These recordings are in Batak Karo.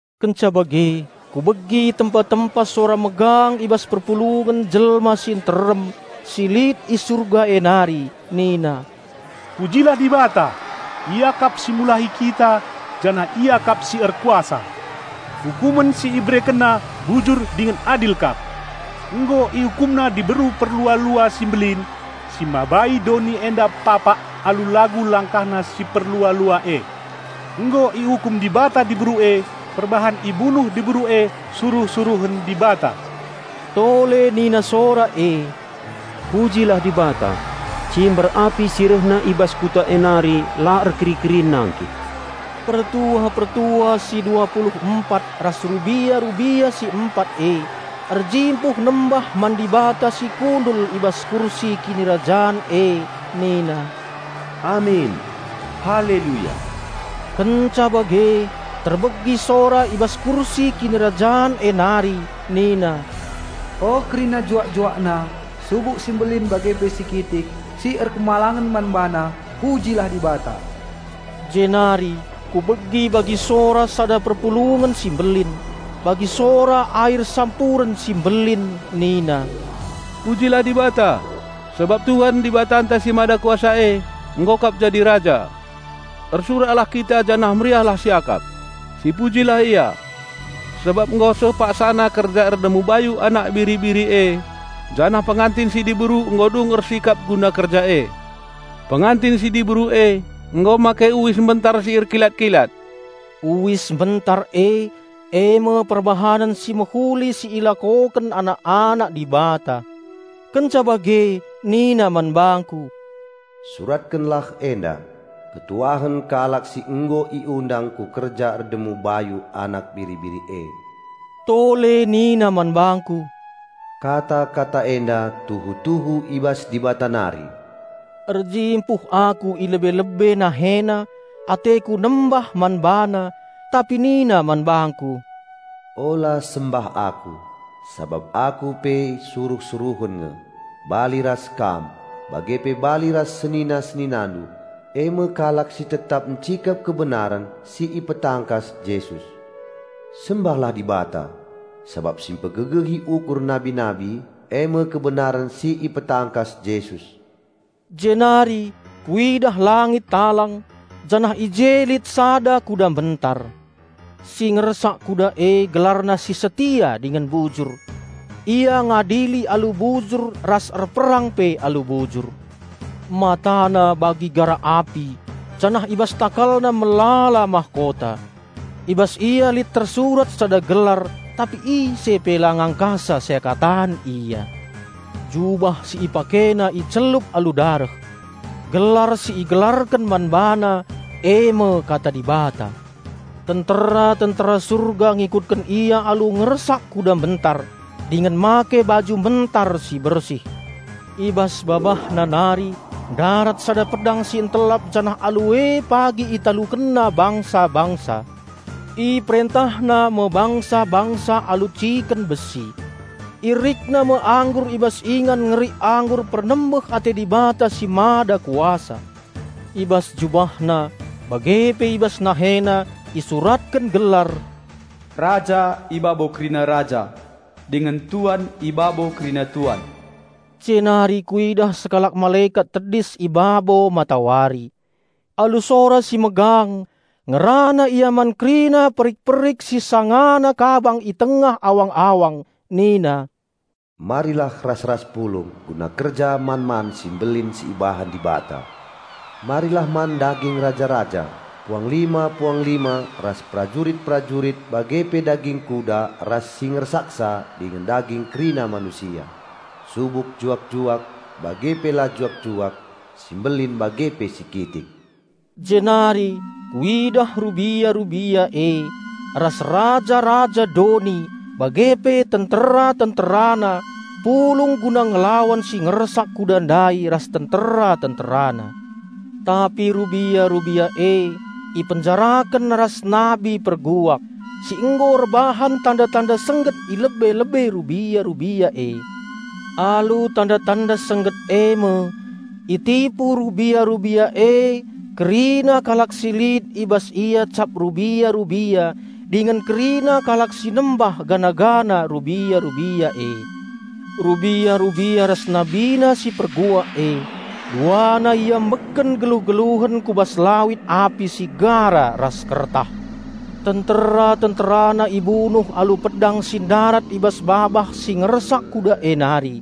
Kenca bage kubegi tempa-tempa sora megang i bas perpulungen jelma si nterem si lit i Surga e nari nina, "Pujilah Dibata! Ia kap empuna keselamaten, ras kuasa. Ukumen si IberekenNa bujur dingen adil kap. Nggo IukumNa diberu perlua-lua si mbelin, si mabai doni enda papak alu lagu langkahna si perlua-lua e. Nggo iukum Dibata diberu e perbahan ibunuh diberu e suruh-suruhen Dibata." Tole nina sora e, "Pujilah Dibata! Cimber api si rehna i bas kuta e nari la erkeri-kerin nangkih." Pertua-pertua si dua pulu empat ras rubia-rubia si empat e, erjimpuh nembah man Dibata si kundul i bas kursi kinirajan e nina, "Amin! Haleluya!" Kenca bage terbegi sora i bas kursi kinirajan e nari nina, "O kerina juak-JuakNa, subuk si mbelin bage pe si kitik, si erkemalangen man BaNa, pujilah Dibata!" Jenari kubegi bagi sora sada perpulungen si mbelin, bagi sora air sampuren si mbelin nina, "Pujilah Dibata! Sabap Tuhan Dibatanta si Mada Kuasa e, nggo kap jadi Raja! Ersuraklah kita janah meriahlah siakap. Sipujilah Ia! Sabap nggo seh paksana kerja erdemu bayu Anak Biri-biri e, janah Pengantin si Diberu nggo dung ersikap guna kerja e. Pengantin si Diberu e nggo make uis mbentar si erkilat-kilat." (Uis mbentar e, eme perbahanen si mehuli si ilakoken anak-anak Dibata.) Kenca bage nina man bangku, "Suratkenlah enda, 'Malem me ate kalak si nggo iundang ku kerja erdemu bayu Anak Biri-biri e.'" Tole nina man bangku, "Kata-kata enda tuhu-tuhu i bas Dibata nari." Erjimpuh aku i lebe-lebe NaheNa, ateku nembah man bana, tapi nina man bangku, "Ola sembah aku, sabap aku pe suruh-suruhen nge, bali ras kam, bage pe bali ras senina-seninandu, e me kalak si tetap ncikep kebenaren si ipetangkas Jesus. Sembahlah Dibata!" Sabap si mpegegehi ukur nabi-nabi eme kebenaren si ipetangkas Jesus. Jenari kuidah langit talang, janah i je lit sada kuda mbentar. Si ngersak kuda e GelarNa si Setia dingen Bujur. Ia ngadili alu bujur ras erperang pe alu bujur. MataNa bagi gara api, janah i bas TakalNa melala mahkota. I bas Ia lit tersurat sada gelar, tapi ise pe la ngangkasa seakatan Ia. Jubah si IpakeNa icelup alu dareh. Gelar si igelarken man BaNa eme Kata Dibata. Tentera-tentera Surga ngikutken Ia alu ngersak kuda mbentar, dingen make baju mbentar si bersih. I bas BabahNa nari ndarat sada pedang si ntelap janah alu e pagi ItalukenNa bangsa-bangsa. IperentahNa me bangsa-bangsa alu ciken besi. IerikNa me anggur i bas ingan ngerik anggur pernembeh ate Dibata si Mada Kuasa. I bas JubahNa bage pe i bas NaheNa isuratken gelar, "Raja i babo kerina raja, dingen Tuan i babo kerina tuan." Jenari kuidah sekalak malekat tedis i babo matawari. Alu sora si megang ngerana ia man kerina perik-perik si sangana kabang i tengah awang-awang nina, "Marilah ras-ras pulung guna kerja man-man si mbelin si ibahan Dibata! Marilah man daging raja-raja, puanglima-puanglima ras prajurit-prajurit bage pe daging kuda ras si ngersaksa dingen daging kerina manusia, subuk juak-juak, bage pe la juak-juak, si mbelin bage pe si kitik!" Jenari kuidah rubia-rubia e, ras raja-raja doni bage pe tentera-tenterana pulung guna ngelawan si ngersak-kuda ndai ras tentera-tenterana. Tapi rubia-rubia e ipenjaraken ras nabi perguak si nggo erbahan tanda-tanda sengget i lebe-lebe rubia-rubia e. (Alu tanda-tanda sengget eme itipu rubia-rubia e kerina kalak si lit i bas ia cap rubia-rubia dingen kerina kalak si nembah patung rubia-rubia e.) Rubia-rubia ras nabina si perguak e, duana iambekken geluh-geluhen ku bas lawit api si gara ras kertah. Tentera-tenterana ibunuh alu pedang si ndarat i bas babah si ngersak kuda e nari;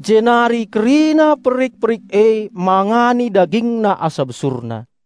jenari kerina perik-perik e mangani dagingna asa besurna.